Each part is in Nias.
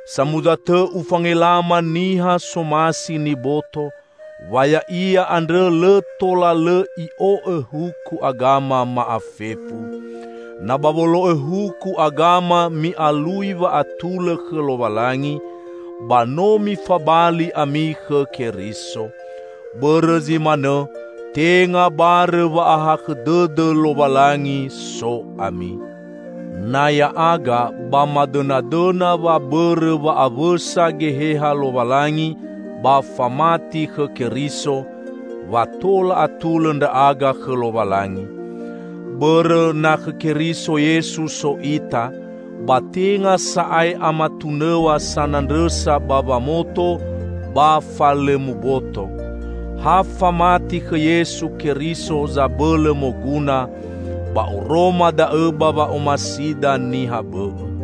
Samuza tõ ufangelama niha somasi niboto, wa ya'ia andrõ lõ tola lõ i'o'õ huku agama ma'afefu! Na ba wolo'õ huku agama mi'alui wa'atulõ khõ Lowalangi, ba no mifabali ami khõ Keriso. Bõrõ zi manõ, tenga barõ wa'ahakhõ dõdõ Lowalangi so ami. Na ya'aga, ba madõnadõna wa bõrõ wa'awõsa Geheha Lowalangi ba famati khõ Keriso, wa tola atulõ ndra'aga khõ Lowalangi. Bõrõ, na khõ Keriso Yesu so ita, ba tenga sa'ae amatunõw̃a sanandrõsa ba wamoto ba fa lõ muboto. Ha famati khõ Yesu Keriso zabõlõ moguna, ba oroma da'õ ba wa'omasida niha bõ'õ.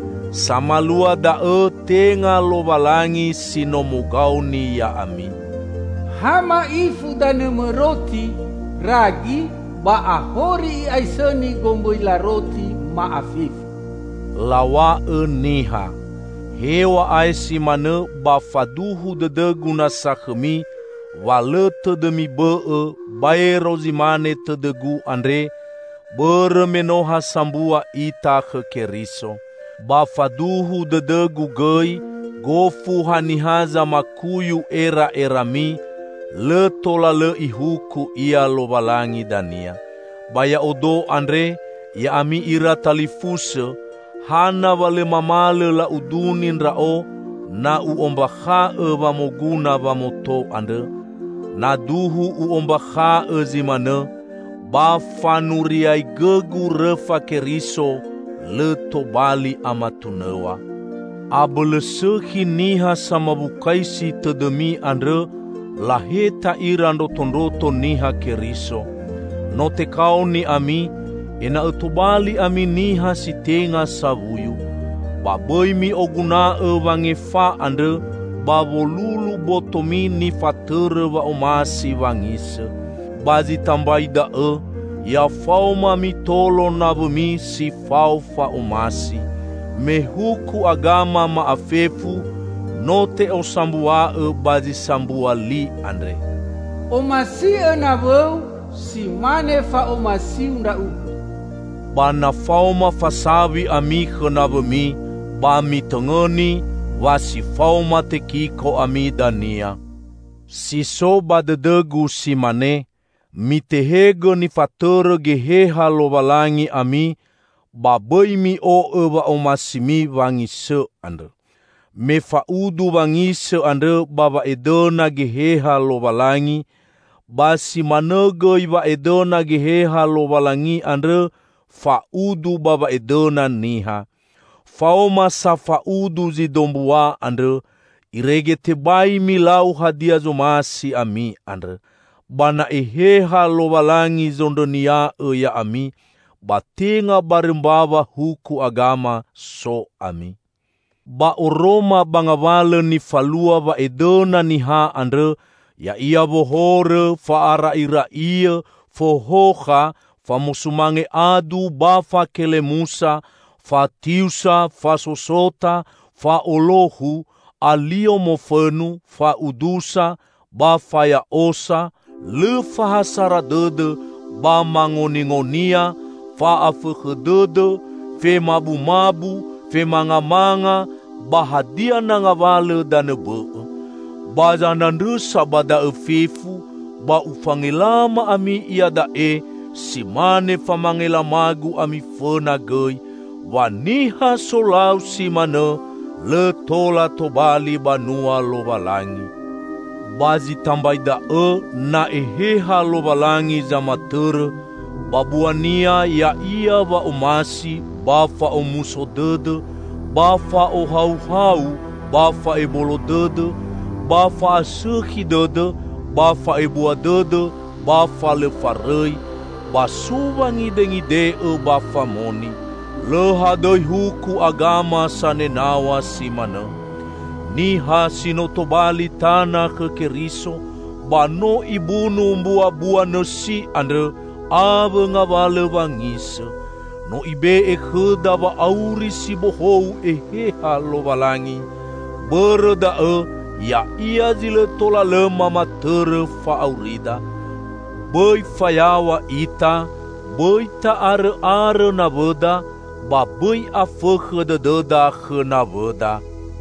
Samalua da'õ tenga Lowalangi si no mogaoni ya'ami! "Ha ma'ifu danõmõ roti (ragi) ba ahori i'aisõni gombõila roti ma'afefu," law̃a'õ niha. Hew̃a'ae si manõ ba faduhu dõdõgu nasa khõmi wa lõ tõdõmi bõ'õ baero zi mane tõdõgu andre, bõrõ me no ha sambua ita khõ Keriso. Ba faduhu dõdõgu gõi gofu haniha zamakuyu era'erami, lõ tola lõ Ihuku ia Lowalangi dania. Ba ya'odo andre, ya'ami ira talifusõ, hana wa lõ mamalõ la'uduni ndra'o na u'ombakha'õ wa moguna wamoto andrõ? Na duhu u'ombakha'õ zi manõ, ba fanuriaigõgu rõfa Keriso lõ tobali amatunõw̃a. Abõlõ sõkhi niha samawukaisi tõdõmi andrõ laheta ira ndrotondroto Niha Keriso! No tekaoni ami, ena'õ tobali ami niha si tenga sawuyu. Ba bõi mi'oguna'õ wangefa andrõ ba wolulu botomi nifatõrõ wa'omasi wangisõ. Ba zi tambai da'õ, ya faoma mitolo nawõmi si fao fa'omasi. Me huku agama ma'afefu no te'osambua'õ ba zi sambua li andre, "Omasi'õ nawõu si mane fa'omasiu ndra'ugõ." Ba na faoma fasawi ami khõ nawõmi, ba mitõngõni, wa si faoma tekiko ami dania. Si so ba dõdõgu si mane: Mitehegõ nifatõrõ Geheha Lowalangi ami, ba bõi mi'o'õ wa'omasimi wangisõ andrõ. Me fa'udu wangisõ andrõ ba wa'edõna Geheha Lowalangi, ba si manõ gõi wa'edõna Geheha Lowalangi andrõ fa'udu ba wa'edõna niha. Faoma sa fa'udu zi dombua andrõ, irege tebai milau hadia zomasi ami andrõ. Ba na Eheha Lowalangi zondrõnia'õ ya'ami, ba tenga barõ mbawa huku agama so ami. Ba oroma ba ngawalõ nifalua wa'edõna niha andrõ, ya'ia wohorõ, fa'ara'ira'iõ, fohokha, famosumange adu ba fakelemusa; fatiusa, fasosota, fa'olohu, alio mofõnu, fa'udusa, ba faya'osa; lõ fa ha sara dõdõ ba mangoningonia, fa'afõkhõ dõdõ, femabumabu, femangamanga, ba hadia na ngawalõ danõ bõ'õ. Ba zanandrõsa ba da'õ fefu, ba ufangelama ami iada'e si mane famangelamagu ami fõna gõi, wa niha solau si manõ, lõ tola tobali banua Lowalangi. Ba zi tambai da'õ, na Eheha Lowalangi zamatõrõ, ba buania ya'ia wa'omasi, ba fa'omuso dõdõ, ba fa'ohauhau, ba fa'ebolo dõdõ, ba fa'asõkhi dõdõ, ba fa'ebua dõdõ, ba fa lõ farõi, ba so wangidengide'õ ba famoni. Lõ hadõi huku agama sanenaw̃a si manõ. Niha si no tobali tana khõ Keriso, ba no ibunu mbuambua nõsi andrõ awõ ngawalõ wangisõ. No Ibe'e khõda wa'auri si bohou Eheha Lowalangi; bõrõ da'õ Ya'ia zi lõ tola lõ mamatõrõ fa'aurida. Bõi fayaw̃a ita, bõi ta'arõ'arõ nawõda, ba bõi afõkhõ dõdõda khõ nawõda.